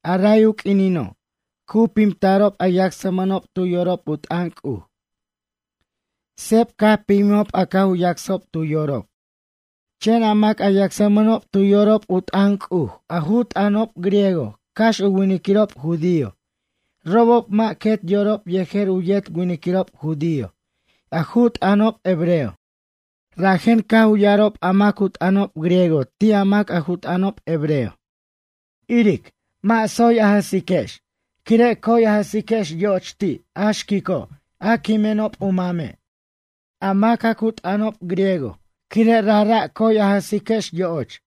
A ray u q'uinino', cu pimtarob a yacsmʌnob tu yorob u t'ʌn C'uj. Seb caj pimjijob a caj u yacsob tu yorob. Chen a mac a yacsmʌnob tu yorob u t'ʌn C'uj a ju t'ʌnob griego, cax u winiquirob judío, robob mʌ' quet yorob yejer u yet winiquirob judío a ju t'ʌnob hebreo. Rajen caj u ya'arob a mac u t'ʌnob griego ti' a mac a ju t'ʌnob hebreo: ―Iric, mʌ' tsoy a jʌsiquex, quire' coy a jʌsiquex yo'och ti' a xquico' a quimenob u mame', a mac a cu t'ʌnob griego, quire' rajra' coy a jʌsiquex yo'och.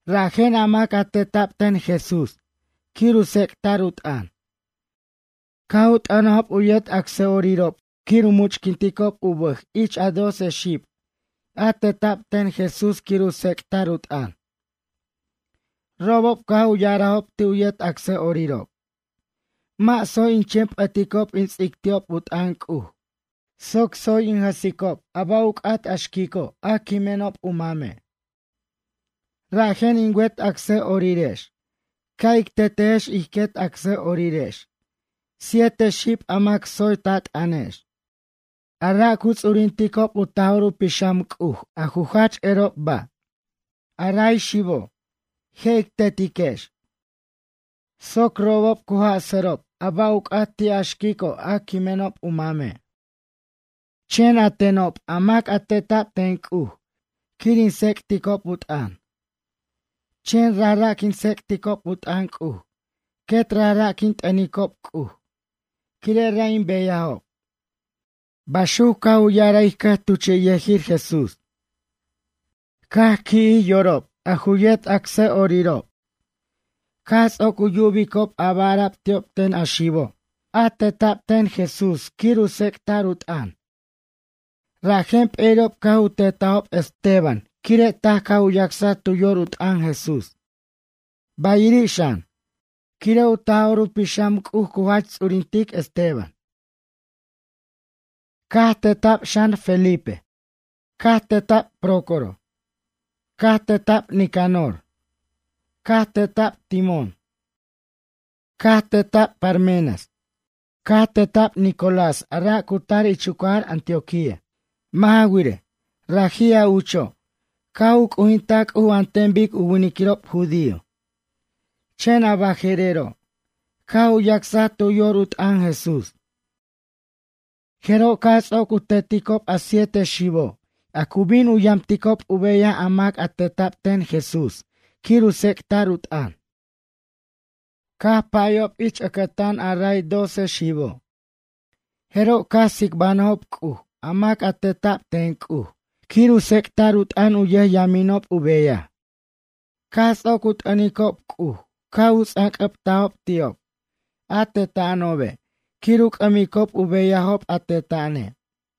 Rajen a mac a teta'b ten Jesús quir u tsec'ta'r u t'ʌn, caj u t'ʌnajob u yet acsa'orirob quir u much'quinticob u bʌj ich a doce xib a teta'b ten Jesús quir u tsec'ta'r u t'ʌn. Robob caj u ya'arajob ti' u yet acsa'orirob: ―Mʌ' tsoy in chen p'ʌticob in tsec'ticob u t'ʌn C'uj soc tsoy in jʌsicob a ba' u c'at a xquico' a quimenob u mame'. Rajen in wet acsa'orirex ca' ic tetejex ich ij quet acsa'orirex siete xib a mac tsoy ta t'ʌnex, a ra' cu ts'urinticob u Taj'or u Pixam C'uj, a ju jach erob ba'. A ray xibob, je' ic tetiquex soc robob cu jasʌrob a ba' u c'at ti' a xquico' a quimenob u mame'. Chen a tenob, a mac a teta'b ten C'uj quir in tsec'ticob u t'ʌn, chen rajra' quin tsec'ticob u t'ʌn C'uj quet rajra' quin t'ʌnicob C'uj quire' ra' in beyajob ―baxuc caj u ya'araj ij cʌjtuchiyʌjir Jesús. Caj qui'jij yorob a ju yet acsʌ'orirob caj ts'oc u yubicob a ba' ara'b ti'ob ten a xibo' a teta'b ten Jesús quir u tsec'ta'r u t'ʌn, rajen p'eri'ob caj u tetajob Esteban, quire' taj caj u yacsaj tu yor u t'ʌn Jesús, bayiri' xan, quire' u Taj'or u Pixam C'uj cu jach ts'urintic Esteban. Caj teta'b xan, Felipe. Caj teta'b Prócoro. Caj teta'b Nicanor. Caj teta'b Timón. Caj teta'b Parmenas. Caj teta'b Nicolás a ra' cu tar ich u cajar Antioquía. Mʌ' ja wirej, raji' a ucho', caj u c'ujintaj C'uj an ten bic u winiquirob judío, chen a baje'rero' caj u yacsaj tu yor u t'ʌn Jesús. Jeroj caj ts'oc u teticob a siete xibo', a cu bin u yamticob u beyaj a mac a teta'b ten Jesús quir u tsec'ta'r u t'ʌn, caj pʌyob ich ʌcʌtan a ray doce xibo'. Jeroj caj tsicbanjʌjob C'uj a mac a teta'b ten C'uj quir u tsec'ta'r u t'ʌn, u yʌjyaminob u beyaj. Caj ts'oc u t'ʌnicob C'uj caj u ts'anc'ʌbtajob ti'ob, a teta'anobe', quir u c'ʌmicob u beyajob a teta'ane'.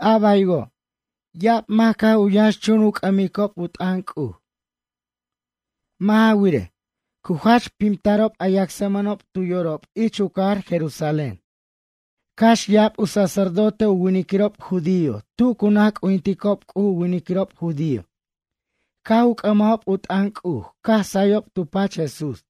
A baywo', ya'ab mac caj u yʌnxchun u c'ʌmicob u t'ʌn C'uj. Mʌ' ja wirej, cu jach pimtarob a yacsmʌnob tu yorob ich u cajar Jerusalén. Cax ya'ab u sacerdote u winiquirob judío tu cu naj c'ujinticob C'uj u winiquirob judío caj u c'ʌmajob u t'ʌn C'uj, caj sayob tu pach Jesús.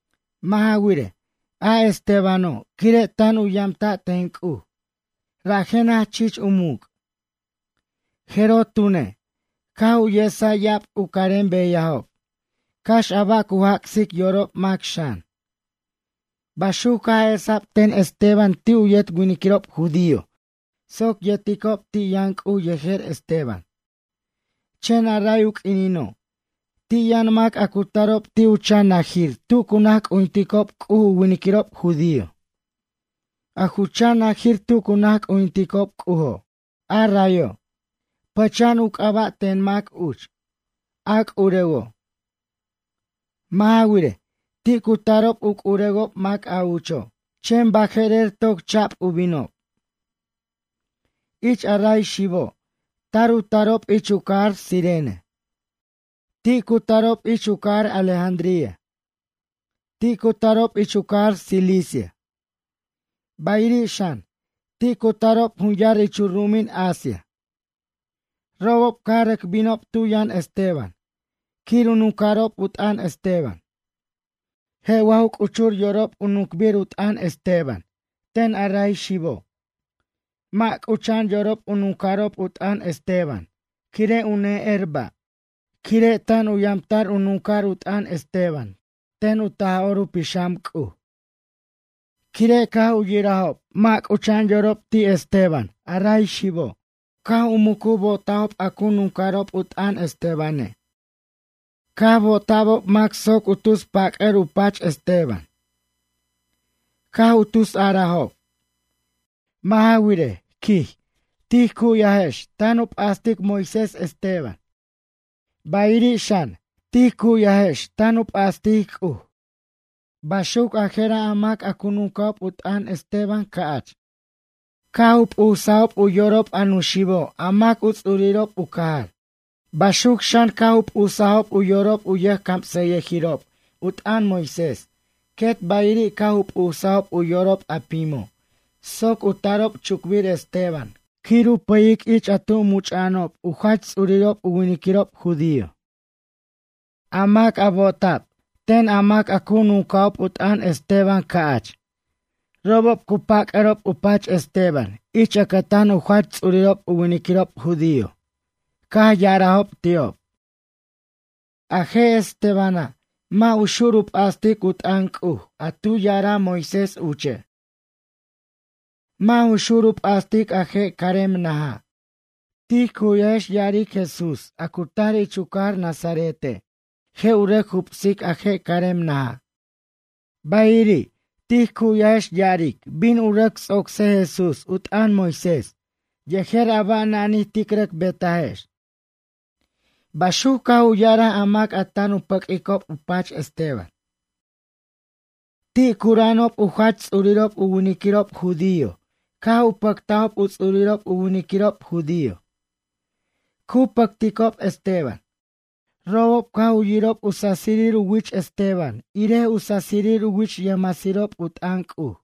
Mʌ' ja wirej, a Estebano' quire' tan u yamta' ten C'uj, rajen jach chich u muc'. Jeroj tune', caj u yesaj ya'ab u carem beyajob, cax a ba' cu jac'sic yorob mac xan. Baxuc caj esa'b ten Esteban ti' u yet winiquirob judío soc yeticob ti' yʌn C'uj yejer Esteban. Chen a ray u q'uinino', ti' yʌn mac a cu tarob ti' u chan najir tu cu naj c'ujinticob C'uj u winiquirob judío. A ju chan najir tu cu naj c'ujinticob C'ujo', a rayo', pʌcha'an u c'aba' ten mac uch: “A c'urewo'.” Mʌ' ja wirej, ti' cu tarob u c'urewob mac a ucho', chen baje'rer toc cha'b u binob. Ich a ray xibo' tar u tarob ich u cajar Cirene. Ti' cu tarob ich u cajar Alejandría. Ti' cu tarob ich u cajar Cilicia. Bayiri' xan, ti' cu tarob jun yar ich u ru'umin Asia. Robob caj rʌc binob tu yʌn Esteban quir u nunca'rob u t'ʌn Esteban. Je' wa ju c'uchur yorob u nuncbir u t'ʌn Esteban ten a ray xibo'? Mʌ' c'ucha'an yorob u nunca'rob u t'ʌn Esteban, quire' u ne'er ba', quire' tan u yamta'r u nunca'r u t'ʌn Esteban ten u Taj'or u Pixam C'uj. Quire' caj u yirajob mʌ' c'ucha'an yorob ti' Esteban, a ray xibo' caj u mucu bo'tajob a cu nunca'rob u t'ʌn Estebane'. Caj bo'ota'bob mac soc u tus pac'ʌr u pach Esteban. Caj u tusarajob: ―Mʌ' ja wirej ―quij―, tij cu'yajex tan u p'astic Moisés, Esteban. Bayiri' xan, tij cu'yajex tan u p'astic C'uj. Baxuc a jera' a mac a cu nunca'ob u t'ʌn Esteban ca'ch, caj u p'usajob u yorob a nuxibo' a mac u ts'urirob u cajar. Baxuc xan, caj u p'usajob u yorob a yʌjcamsʌjʌjirob u t'ʌn Moisés, quet bayiri' caj u p'usajob u yorob a pimo' soc u tarob chucbir Esteban quir u pʌyic ich tu much'a'anob u jach ts'urirob u winiquirob judío. A mac a bo'ota'b ten a mac a cu nunca'ob u t'ʌn Esteban ca'ch, robob cu pac'arob u pach Esteban ich ʌcʌtan u jach ts'urirob u winiquirob judío. Caj ya'arajob ti'ob: ―A je' Estebana', mʌ' u xur u p'astic u t'ʌn C'uj a tu ya'araj Moisés uche'. Mʌ' ju xur u p'astic a je' carem naja'. Tij cu'yajex ya'aric, Jesús, a cu tar ich u cajar Nazarete', je' u rʌc jubsic a je' carem naja'. Bayiri', tij cu'yajex ya'aric bin u rʌc ts'ocsej Jesús u t'ʌn Moisés yejer a ba' nanij tic rʌc betajex ―baxuc caj u ya'araj a mac a tan u pʌq'uicob u pach Esteban. Ti' cura'anob u jach ts'urirob u winiquirob judío caj u pʌctajob u ts'urirob u winiquirob judío. Cu pʌcticob Esteban. Robob caj u yirob u sasir u wich Esteban irej sasir u wich yʌjmasirob u t'ʌn C'uj.